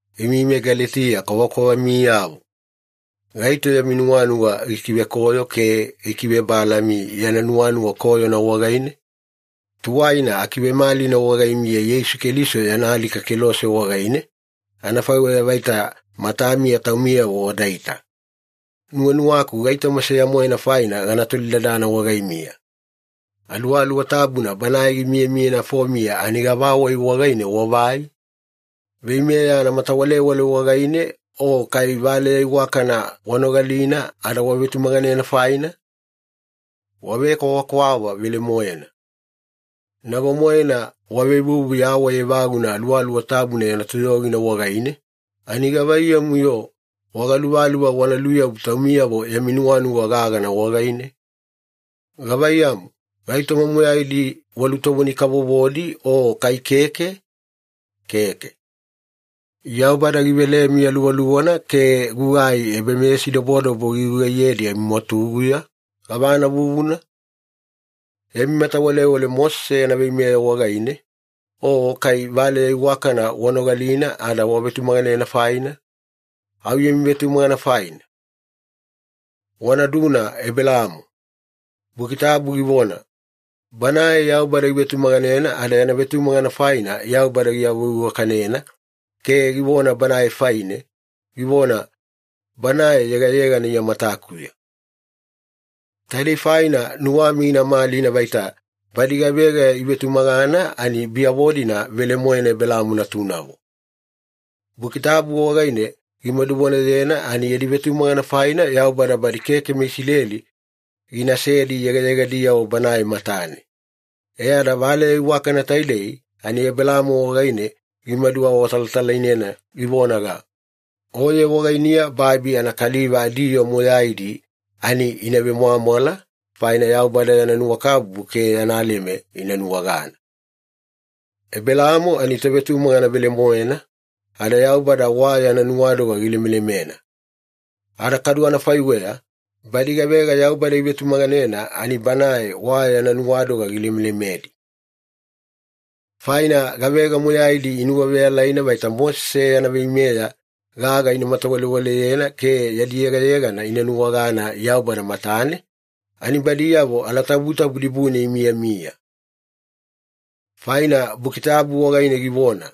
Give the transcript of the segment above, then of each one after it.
Imi meGaletiya kwavakwavamiyavo! Gaito yami nuwanuwa gikivekoyo ke gikivebalami yana nuwanuwa koyona wagaine? Tuwaina akivemalina wagaimiya Yeisu Keliso yana alika kelose wagaine, anafaiweya vaita matamiya taumiyavo wadaita. Nuwanuwaku gaitoma seya-moena faina gana tolidadana wagaimiya. Aluwaluwa Tabuna Banae gimiyamiya nafomiya ani gavawai wagaine wavai? Veimeya anamatawalewale wagaine, o kai valeya iwakana wanogalina ada wavetumaganena faina? Wavekwavakwava velemoena! Nago-moena wavevuvu yawai evaguna Aluwaluwa Tabuna yana toyogina wagaine, ani gavaiyamu-yo wagaluvaluva wana luyabu taumiyavo yami nuwanuwa gagana wagaine? Gavaiyamu, gaitoma moyaidi walutovoni-kavovodi o kai keke? Keke. Yaubada givelemi Aluwaluwana ke gugai ebameyasidobodobo gigugaiyedi amimwatuguya, gavana vuvuna? Yami matawalewale Mosese yana veimeya wagaine, o kai valeya iwakana wanogalina ada wavetumaganena faina? Au yami vetumagana faina. Wanaduna Ebelaamo. Buki Tabu givona, “Banae Yaubada givetumaganena ada yana vetumagana faina, Yaubada giawaveiwakanena ke givona banae faine, givona, ‘Banae yegayegana Iya matakuya.’” Taidei faina nuwami gina malina vaita badi gavega ivetumagana ani biyavo-dina velemoena Ebelaamo natunavo. Buki Tabu wagaine gimaduvonayena ani yadi vetumagana faina, Yaubada badi keke meIsileli ginasedi yegayegadiyavo Banae matane. E ada Valeya Iwakana taidei ani Ebelaamo wagaine gimaduawatalatalainena, givonaga, “Oye wagainiya babi anakaliva adiyoo moyaidi ani ina vemwamwala, faina Yaubada yana nuwakabubu ke yana leme ina nuwagana.” Ebelaamo ani tovetumagana velemoena, ada Yaubada wa yana nuwadoga gilemelemena. Ada kadu anafaiweya, badi gavega Yaubada ivetumaganena ani Banae wa yana nuwadoga gilemelemedi. Faina gavega moyaidi inuwaveyalaina vaita Mosese yana veimeya gaga ina matawalewaleyena ke yadi yegayegana ina nuwagana Yaubada matane, ani badiyavo alatabutabu dibune imiyamiya. Faina Buki Tabu wagaine givona,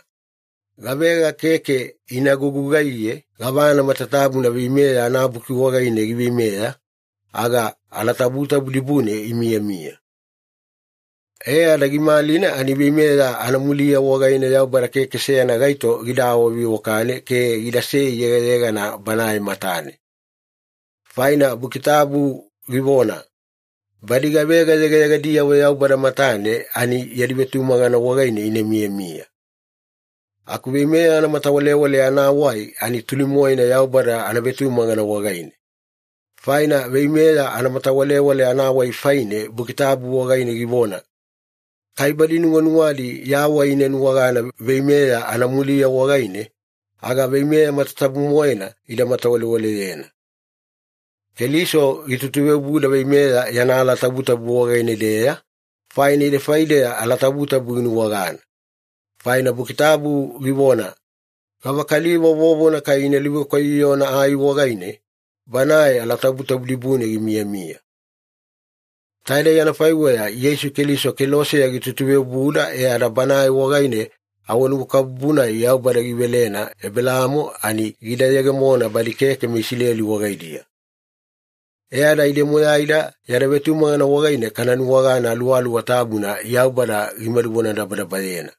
“Gavega keke ina gugugaiye gavana matatabuna Veimeya anabuki wagaine giveimeya, aga alatabutabu dibune imiyamiya.” E ada gimalina ani veimeya anamuliya wagaine Yaubada keke seyana gaito gida awaveiwakane ke gidasei yegayegana Banae matane. Faina Buki Tabu givona, “Badi gavega yegayegadiyavo Yaubada matane ani yadi vetumagana wagaine ina miyamiya.” Aku veimeya anamatawalewale anawai ani tuli-moena Yaubada anavetumagana wagaine. Faina veimeya anamatawalewale anawai faine Buki Tabu wagaine givona, “Kai badi nuwanuwadi yawai ina nuwagana veimeya anamuliya wagaine, aga veimeya matatabu-moena ida matawalewaleyena.” Keliso gitutuveobuda veimeya yana alatabutabu wagaine-deya, faina ide faideya alatabutabu ginuwagana. Faina Buki Tabu givona, “Gavakaliva vovona kai ina luvekwaiyoyona ai wagaine, banae alatabutabu dibune gimiyamiya.” Taidei anafaiweya Yeisu Keliso keloseya gitutuveobuda e ada Banae wagaine awanuwakabubu-nai Yaubada givelena Ebelaamo ani gida yegemona badi keke meIsileli wagaidiya. E ada ide moyaida yada vetumagana wagaine kana nuwagana Aluwaluwa Tabuna Yaubada gimadu vonadabadabayena.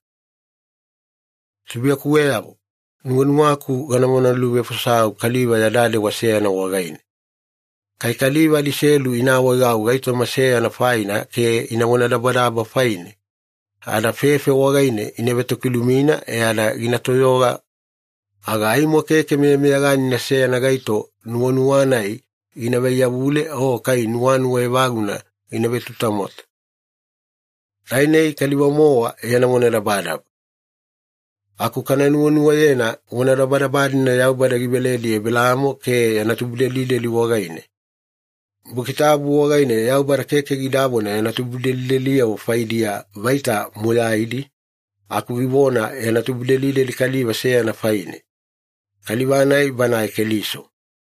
Tubuiyakuweyavo, nuwanuwaku gana vonaluvefosau kaliva yada dewa seyana wagaine. Kai kaliva adiselu ina awaegau gaitoma seyana faina ke ina vonadabadaba faine, ada fefe wagaine ina vetokilumina e ada gina toyoga, aga aimo keke meyameyaganina seyana gaito nuwanuwa-nai gina vaiyavule o kai nuwanuwa evaguna gina vetutamwata. Tainei kaliva-mowa yana vonadabadaba. Aku kana nuwanuwayena vonadabadaba-dina Yaubada giveledi Ebelaamo ke yana tubudelideli wagaine. Buki Tabu wagaine Yaubada keke gidavona ‘yana tubudelideliyavo faidiya’ vaita moyaidi, aku givona ‘yana tubudelideli’ kaliva seyana faine, kaliva-nai Banae Keliso.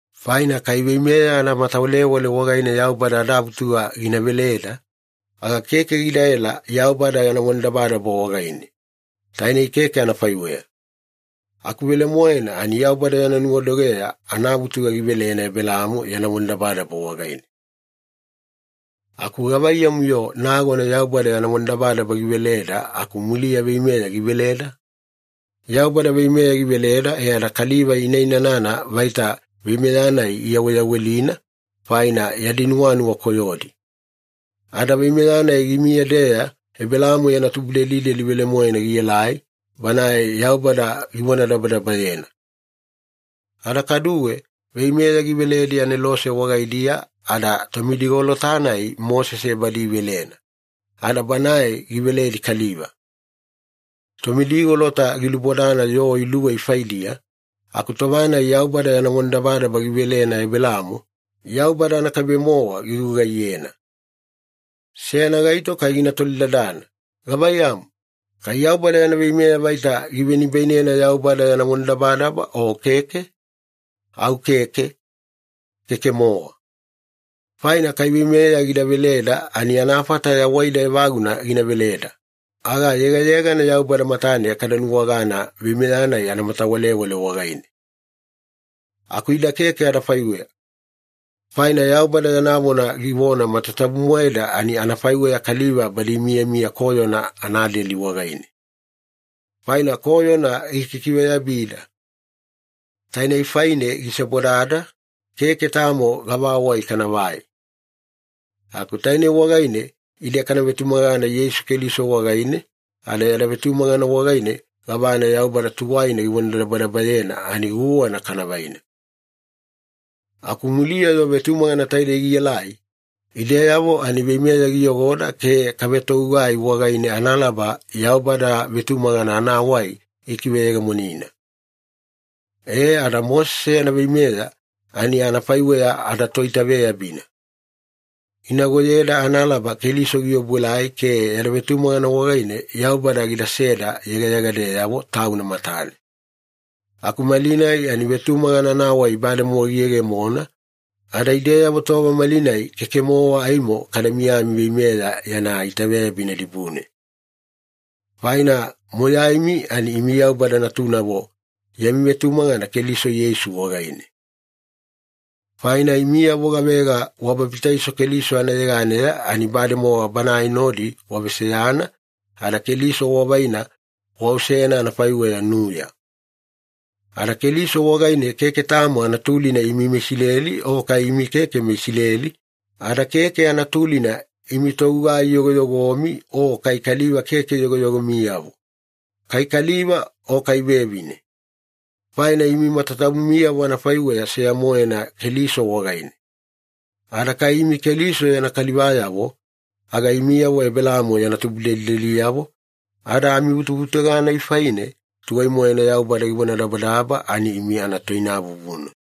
Faina kai veimeya anamatawalewale wagaine Yaubada adavutuga gina veleda, aga keke gidaela Yaubada yana vonadabadaba wagaine. Tainei keke anafaiweya. Aku anavelemoena ani Yaubada yana nuwadogeya anavutuga givelena Ebelaamo yana vonadabadaba wagaine. Aku gavaiyamu-yo nagona Yaubada yana vonadabadaba giveleda aku muliya veimeya giveleda? Yaubada veimeya giveleda e ada kaliva ina inanana vaita veimeya-nai iyaweyawelina, faina yadi nuwanuwa koyodi. Ada veimeya-nai gimiya-deya Ebelaamo yana tubudelideli velemoena gielai, Banae Yaubada givonadabadabayena. Ada kaduwe, veimeya giveledi anelose wagaidiya ada tomidigolota-nai Mosese badi ivelena, ada banae giveledi kaliva. Tomidigolota gilubodana yoo iluwei faidiya, aku tova-nai Yaubada yana vonadabadaba givelena Ebelaamo, Yaubada anakaibe-mowa gigugaiyena. Seyana gaito kai gina tolidadana, “Gavaiyamu, kai Yaubada yana veimeya vaita givenibainena Yaubada yana vonadabadaba o keke?” Au keke, keke-mowa! Faina kai veimeya gida veleda ani anafata yawaida evaguna gina veleda, aga yegayegana Yaubada matane kada nuwagana veimeya-nai anamatawalewale wagaine. Aku ida keke anafaiweya. Faina Yaubada yana vona givona matatabu-moeda ani anafaiweya kaliva badi imiyamiya koyona anadeli wagaine. Faina koyona gikikiveyabida. Tainei faine gisebodada, keke tamo gavawai kanavai. Aku tainei wagaine ide kana vetumagana Yeisu Keliso wagaine, ada yada vetumagana wagaine gavana Yaubada tuwaina givonadabadabayena ani guwana kana vaina. Aku muliya-yo vetumagana taidei gielai, ideyavo ani veimeya giyogoda ke kavetogugai wagaine analaba Yaubada vetumagana anawai gikiveyegemonina. E, ada Mosese yana veimeya ani anafaiweya adatoitaveyabina. Ginagoyeda analaba Keliso giobuelai ke yada vetumagana wagaine Yaubada gidaseda yegayegadeyavo Tauna matane. Aku malinai ani vetumagana anawai bademowa giyegemona, ada ideyavo tova malinai keke-mowa aimo kada miyami veimeya yana itaveyabina dibune. Faina moyaimi ani imi Yaubada natunavo yami vetumagana Keliso Yeisu wagaine. Faina imiyavo gavega wababitaiso Keliso anayeganeya ani bademowa Banae nodi waveseyana ada Keliso wavaina waosena anafaiweya nuya. Ada Keliso wagaine keke tamo anatulina imi meIsileli o kai imi keke meIsileli, ada keke anatulina imi togugai yogoyogomi o kai kaliva keke yogoyogomiyavo, kai kaliva o kai vevine. Faina imi matatabumiyavo anafaiweya seya-moena Keliso wagaine. Ada kai imi Keliso yana kalivayavo, aga imiyavo Ebelaamo yana tubudelideliyavo, ada amivutuvutuga-nai faine tuwai-moena Yaubada givonadabadaba ani imi anatoinavuvuna.